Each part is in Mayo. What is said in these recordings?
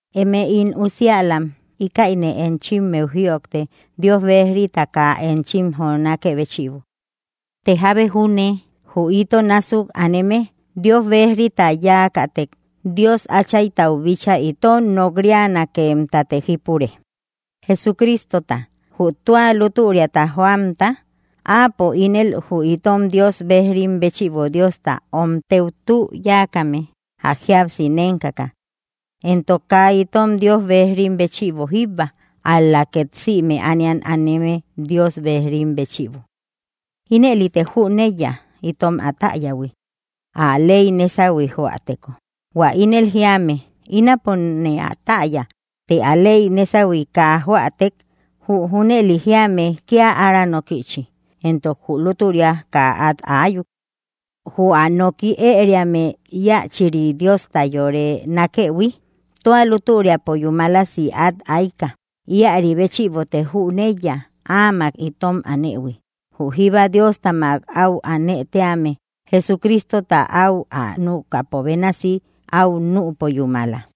Emëe ín usiälam, íkäine enchimmeu jïojte Dios bejrita kaa enchim jonákë béchïbo. Të jábe júne jü ito násuk aneme Dios bejrita yáakätek, Dios Áchaytau bíchaa itom nok‑rianakemtate jípure, Jesucristota, jü tua lútüriata joamta. Áapo ínel jü itom Dios bejrim béchïbo Diosta omtëu tü yáakame ä jíapsi nénkaka, éntok kaa itom Dios bejrim béchïbo jíbba, ál‑la két sïme ániat aneme Dios bejrim béchïbo. Ínelïte jünëiya itom ä täyähui, ä ley nésauhui joäteko. Huä ínel jiame: Ínapone ä täya, të ä ley nésauhui kaa joätek, jü junëli jiame kia ára nókïchi, entok jü lútüria kaa at ayuk. Jü ä noki ëriame íachiri Diosta yore nákehui tua lútüriapo yúmalasi at ayka. Ïari béchïbote jüneiya Áamak itom anëhui. Jü jíba Diostamak áu anëtíame, Jesucristota áu ä nükäpo bénasi áu nüpo yúmala.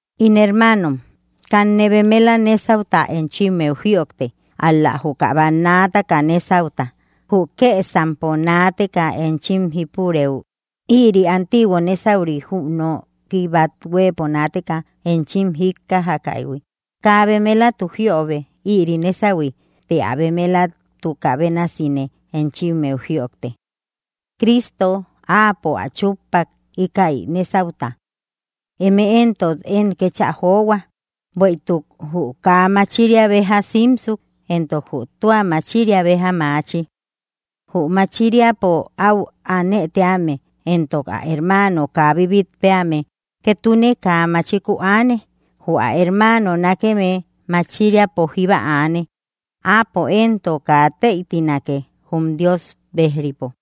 In hermaanom, kanne bemela nésauta enchimmeu jïojte, ál‑la juka bannaataka nesauta, jü kesampo naateka enchim jipurëu. Ïri antiguo nésauri jü nooki bat huëpo naateka enchim jíkkajakäihui. Kaa bemelatu jiobe ïri nésahui të ä bemelatukä bénasine enchimmeu jïojte. Cristo, áapo ä chuppak ikäi nesauta. Eme entok, én kécha johua. Buetuk jü kaa machiria beja simsu, entok jü tua machiria beja machi. Jü machiriapo au anëtíame entok ä hermaano kaa bibitpeame, ketune kaa machiku aane. Jü ä hermaano nákeme machiriapo jíba anë, áapo entok kaa teitinake jum Dios bejripo.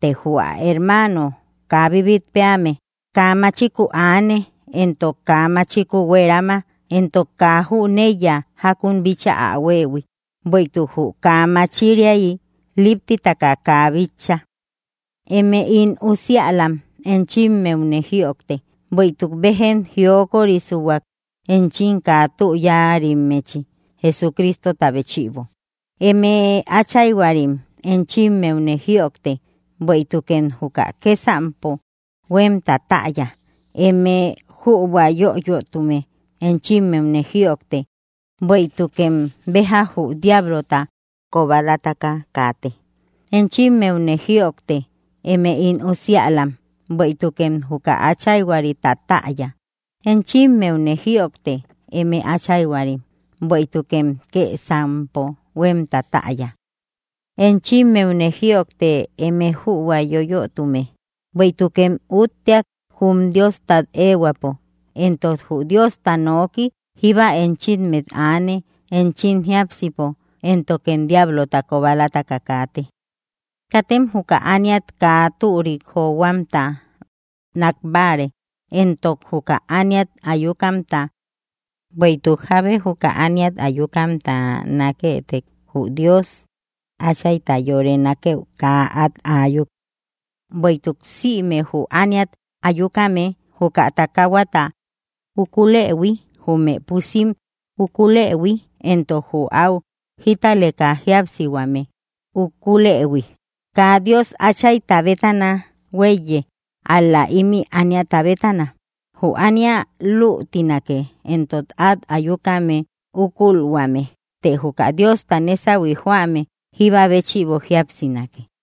Të jü ä hermaano kaa bibitpeame, kaa machiku aane entok kaa machiku huerama entok kaa jüneiya jákun bíchaa ä huëhui, bueïtuk jü kaa máchiriai liptitaka kaa bitcha. Eme ín usiälam, enchimmeune jïojte, bueïtuk béjem jiokorisuak enchim kaa tü yáarimmechi, Jesucristota béchïbo. Eme áchayhuarim, enchimmeune jïojte, bueïtukem juka kësampo huemta täya. Eme jübua yoyötume, enchimmeune jïojte, bueïtukem béja jü diablota kobalataka kaate. Enchimmeune jïojte, eme ín usiälam, bueïtukem juka Áchayhuarita täya. Enchimmeune jïojte, eme áchayhuarim, bueïtukem kësampo huemta täya. Enchimmeune jïojte, eme jübua yoyötume, bueïtukem üutteak jum Diosat ehuäpo, entok jü Diosta noki jíba enchimmet aane enchim jíapsipo, éntokem diablota kobalataka kaate. Katem juka ániat kaa türik johuamta nakbare entok juka ániat ayukamta, bueïtuk jábe juka ániat ayukamta naketek jü Dios Achayta yore nakeu kaa at ayuk. Bueïtuk sïme jü ániat ayukame, juka takahuata ukulehui, jume pusim ukulehui, entok jü au jítaleka jíapsihuame, kaa Dios Áchayta bétana huéiye, ál‑la, ímï ániata bétana. Jü ánia luutinake éntok at ayukame ukulhuame. Të juka Diosta nésahui joame jíba béchïbo jíapsinake.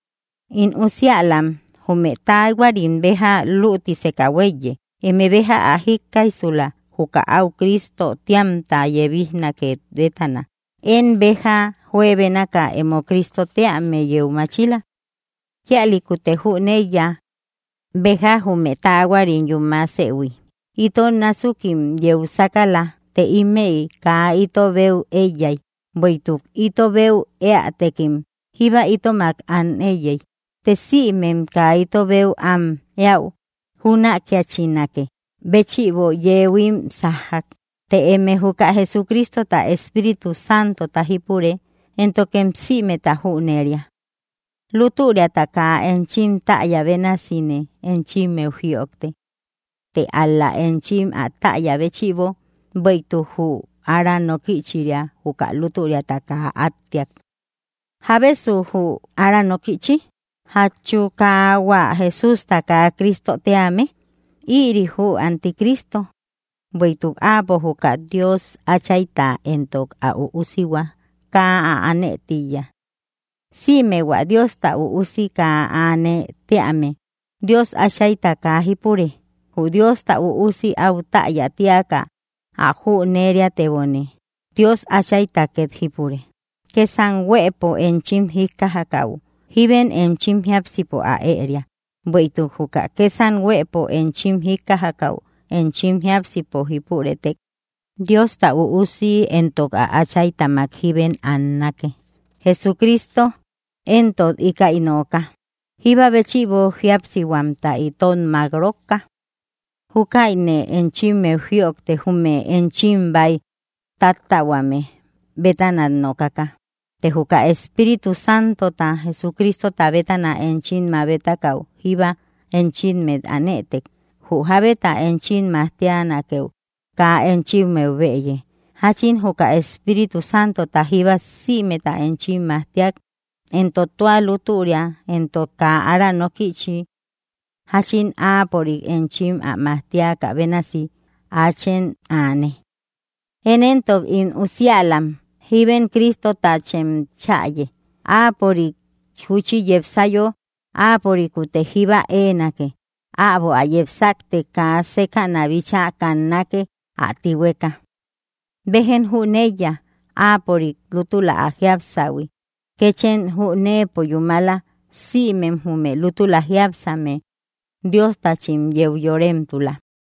In usiälam, jume taahuarim béja lútisëka huéiye. Eme béja ä jíkkaijsula, juka áu Cristo tíamta yebijnake bétana. Én béja juebénaka emo Cristo tíame yeu machila. Kíalïkute jüneiya béja jume taahuarim yúmasëhui. Ito násukim yeu sákala, të ímëi kaa ito beu éiyay, bueïtuk ito beu éätekim jíba itomak an éiyey. Të sïmem kaa ito beu am eäu jünakiachinakë béchïbo, yeuhuim sájjak. Të eme juka Jesucristota Espíritu Santota jípure, éntokem sïmeta jüneria. Lútüriata kaa enchim täya bénasine enchimmeu jïojte. Të ál‑la enchim ä täya béchïbo: bueïtuk jü ára nókïchiria juka lútüriata kaa attiak. ¿Jábesu jü ára nókïchi? ¿Jachu kaa hua Jesústa kaa Cristo tíame? Irï jü anticristo, bueïtuk áapo juka Dios Áchayta entok ä üusihua kaa ä aane tíiya. Sïme hua Diosta üusi kaa aane tíame, Dios Áchayta kaa jipure, jü Diosta üusi au täya tiaka ä jüneriatebome Dios Áchayta ket jipure. Kësam huëpo enchim jíkkajakäu, jíbem enchim jiápsipo ä ëria. Bueïtuk juka kësam huëpo enchim jíkkajakäu enchim jiápsipo jípurëtek, Diosta Üusi entok ä Áchaytamak jíbem annake, Jesucristo éntok íkäi nooka, jíba béchïbo jíapsihuamta itom mak rókka. Júkäine enchimmeu jïojte jume enchim bäi táttähuame bétana nokaka. Të juka Espíritu Santota Jesucristota bétana enchim mabetakau jíba enchimmet anëtek, jü jabeta enchim majtianakeu kaa enchimmeu bëye; jachin juka Espíritu Santota jíba sïmeta enchim majtia, entok tua lútüria entok kaa ára nokïchi. Jachin Áapörik enchim ä majtiakä bénasi, áachem aane. Én éntok, ín usiälam, jíbem Cristotachem chäye, Áapörik júchi yepsayo áapörikutte jíba eenake, äbo ä yepsakte kaa sekäna bíchaa kannake ä tíhueka. Béjem jüneiya Áapörik lútula ä jiapsähui, kéchem jüneepo yúmala sïmem jume lútula jiápsame Diostachim yeu yoremtula.